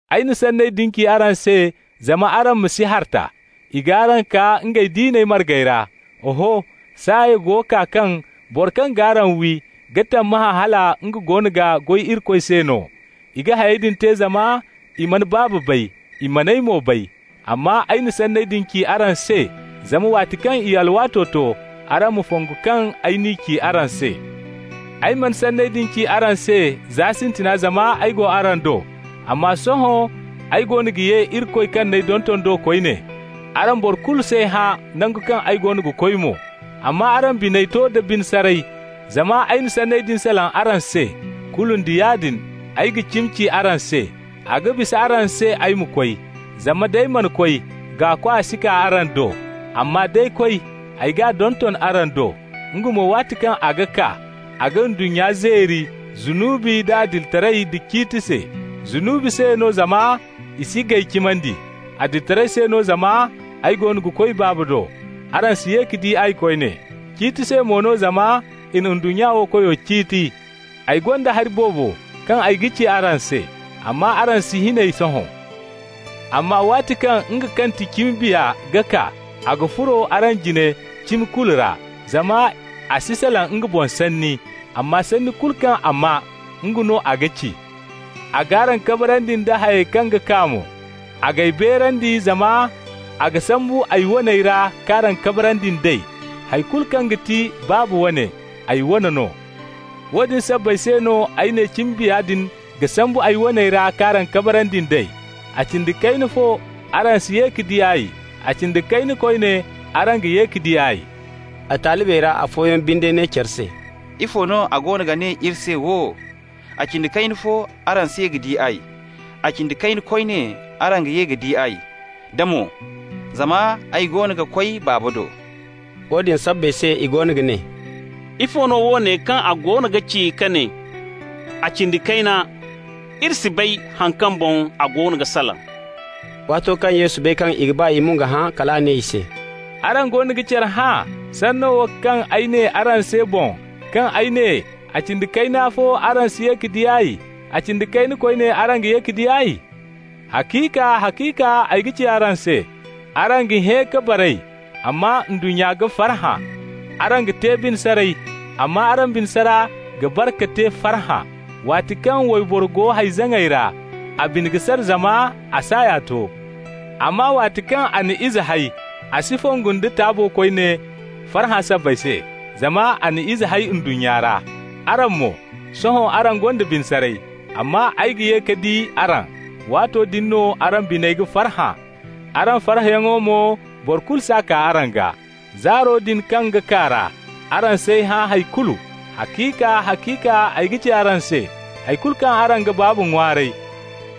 Ay na sanney din ci araŋ se zama araŋ ma si harta. I g'araŋ kaa ngey diina margey ra. Oho, saaya go kaa kaŋ boro kaŋ g'araŋ wi ga tammahã hala nga goono ga goy Irikoy se no. I ga hayey din te zama i mana Baaba bay, i man'ay mo bay. Amma ay na sanney din ci araŋ se zama waati kaŋ i alwaato to, araŋ ma fongu kaŋ ay n'i ci araŋ se. Ay mana sanney din ci araŋ se za sintina zama ay go araŋ do. Amma sohõ ay goono ga ye Irikoy kaŋ n'ay donton do koyne. Araŋ boro kulu s'ay hã nango kaŋ ay go ga koy mo. Amma araŋ biney to da bine saray zama ay na sanney din salaŋ araŋ se. Kulu nda yaadin ay ga cimi ci araŋ se: a ga bisa araŋ se ay ma koy, zama nd'ay mana koy, Gaakwa si kaa araŋ do. Amma d'ay koy, ay g'a donton araŋ do. Nga mo, waati kaŋ a ga kaa, a ga ndunnya zeeri zunubi da adilitaray da ciiti se. Zunubi se no zama i si g'ay cimandi. Adilitaray se no zama ay goono ga koy Baaba do, araŋ si ye ka di ay koyne. Ciiti se mo no zama i na ndunnya wo koyo ciiti. Ay gonda hari boobo kaŋ ay ga ci araŋ se, amma araŋ si hin ey sohõ. Amma waati kaŋ nga kaŋ ti cimi Biya ga kaa, a ga furo araŋ jine cimi kulu ra, zama a si salaŋ nga boŋ sanni, amma sanni kulu kaŋ a maa, nga no a ga ci. A g'araŋ kabarandi nda hayey kaŋ ga kaa mo. A g'ay beerandi, zama a ga sambu ay waney ra k'araŋ kabarandi nd'ey. Hay kulu kaŋ ga ti Baaba wane, ay wane no. Woodin sabbay se no ay ne cimi Biya din ga sambu ay waney ra k'araŋ kabarandi nd'ey. A cindi kayna fo araŋ si ye ka di ay, a cindi kayna koyne araŋ ga ye ka di ay.» A talibey ra afooyaŋ binde ne care se: «Ifo no a goono ga ne iri se wo: ‹A cindi kayna fo araŋ si ye ka di ay, a cindi kayna koyne araŋ ga ye ka di ay›, da mo: ‹Zama ay goono ga koy Baaba do›?» Woodin sabbay se i goono ga ne: «Ifo no woone kaŋ a goono ga ci ka ne: ‹a cindi kayna›? Iri si bay haŋ kaŋ boŋ a goono ga salaŋ.» Waato kaŋ Yesu bay kaŋ i ga ba ngey ma nga hã, kal a ne i se: «Araŋ goono ga care hã sanno wo kaŋ ay ne araŋ se boŋ, kaŋ ay ne: a cindi kayna fo araŋ si ye ka di ay, a cindi kayna koyne araŋ ga ye ka di ay? Haciika, haciika ay ga ci araŋ se: araŋ ga hẽ ka baray, amma ndunnya ga farhã. Araŋ ga te bine saray, amma araŋ bine sara ga bare ka te farhã. Waati kaŋ wayboro go hay-zaŋay ra, a bine ga sara zama a saaya to, amma waati kaŋ a na ize hay, a si fongu nda taabo koyne farhã sabbay se, zama a na ize hay ndunnya ra. Araŋ mo, sohõ araŋ gonda bine saray, amma ay ga ye ka di araŋ. Waato din no araŋ biney ga farhã, araŋ farhãyaŋo mo boro kulu s'a kaa araŋ gaa. Zaaro din kaŋ ga kaa ra, araŋ s'ay hã hay kulu. Haciika, haciika ay ga ci araŋ se: hay kulu kaŋ araŋ ga Baaba ŋwaaray,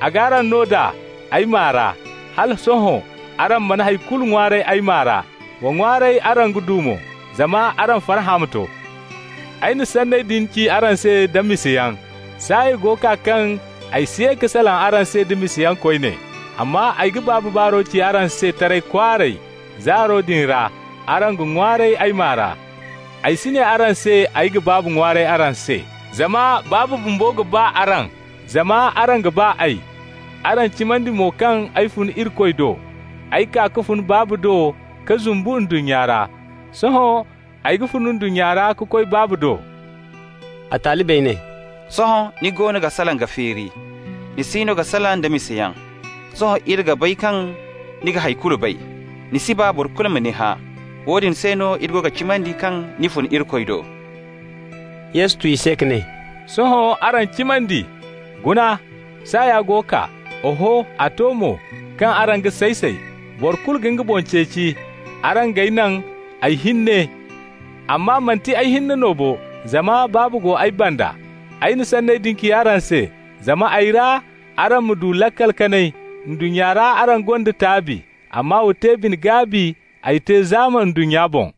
a g'araŋ no nd'a ay maa ra. Hala sohõ araŋ mana hay kulu ŋwaaray ay maa ra. Wa ŋwaaray, araŋ ga du mo, zama araŋ farhã ma to. Ay na sanney din ci araŋ se da misayaŋ. Saaya go kaa kaŋ ay si ye ka salaŋ araŋ se da misayaŋ koyne, amma ay ga Baaba baaro ci araŋ se taray kwaaray. Zaaro din ra araŋ ga ŋwaaray ay maa ra. Ay si ne araŋ se ay ga Baaba ŋwaaray araŋ se, zama Baaba bumbo ga ba araŋ zama araŋ ga ba ay, araŋ cimandi mo kaŋ ay fun Irikoy do. Ay kaa ka fun Baaba do ka zumbu ndunnya ra. Sohõ, ay ga fun ndunnya ra ka koy Baabo do.» A talibey ne: «Sohõ ni goono ga salaŋ ka feeri. Ni si no ga salaŋ da misayaŋ. Sohõ iri ga bay kaŋ ni ga hay kulu bay, ni si ba boro kulu ma ni hã. Woodin se no iri go ga cimandi kaŋ ni fun Irikoy do.» Yesu tu i se ka ne: «Sohõ araŋ cimandi! Guna, saaya go kaa, oho, a to mo, kaŋ araŋ ga say-say. Boro kulu ga nga boŋ ceeci, araŋ g'ay naŋ ay hinne. Amma manti ay hinne no bo, zama Baaba go ay banda. Ay na sanney din ci araŋ se, zama ay ra araŋ ma du laakal kanay. Ndunnya ra araŋ gonda taabi, amma wa te bine-gaabi, ay te zaama ndunnya boŋ.»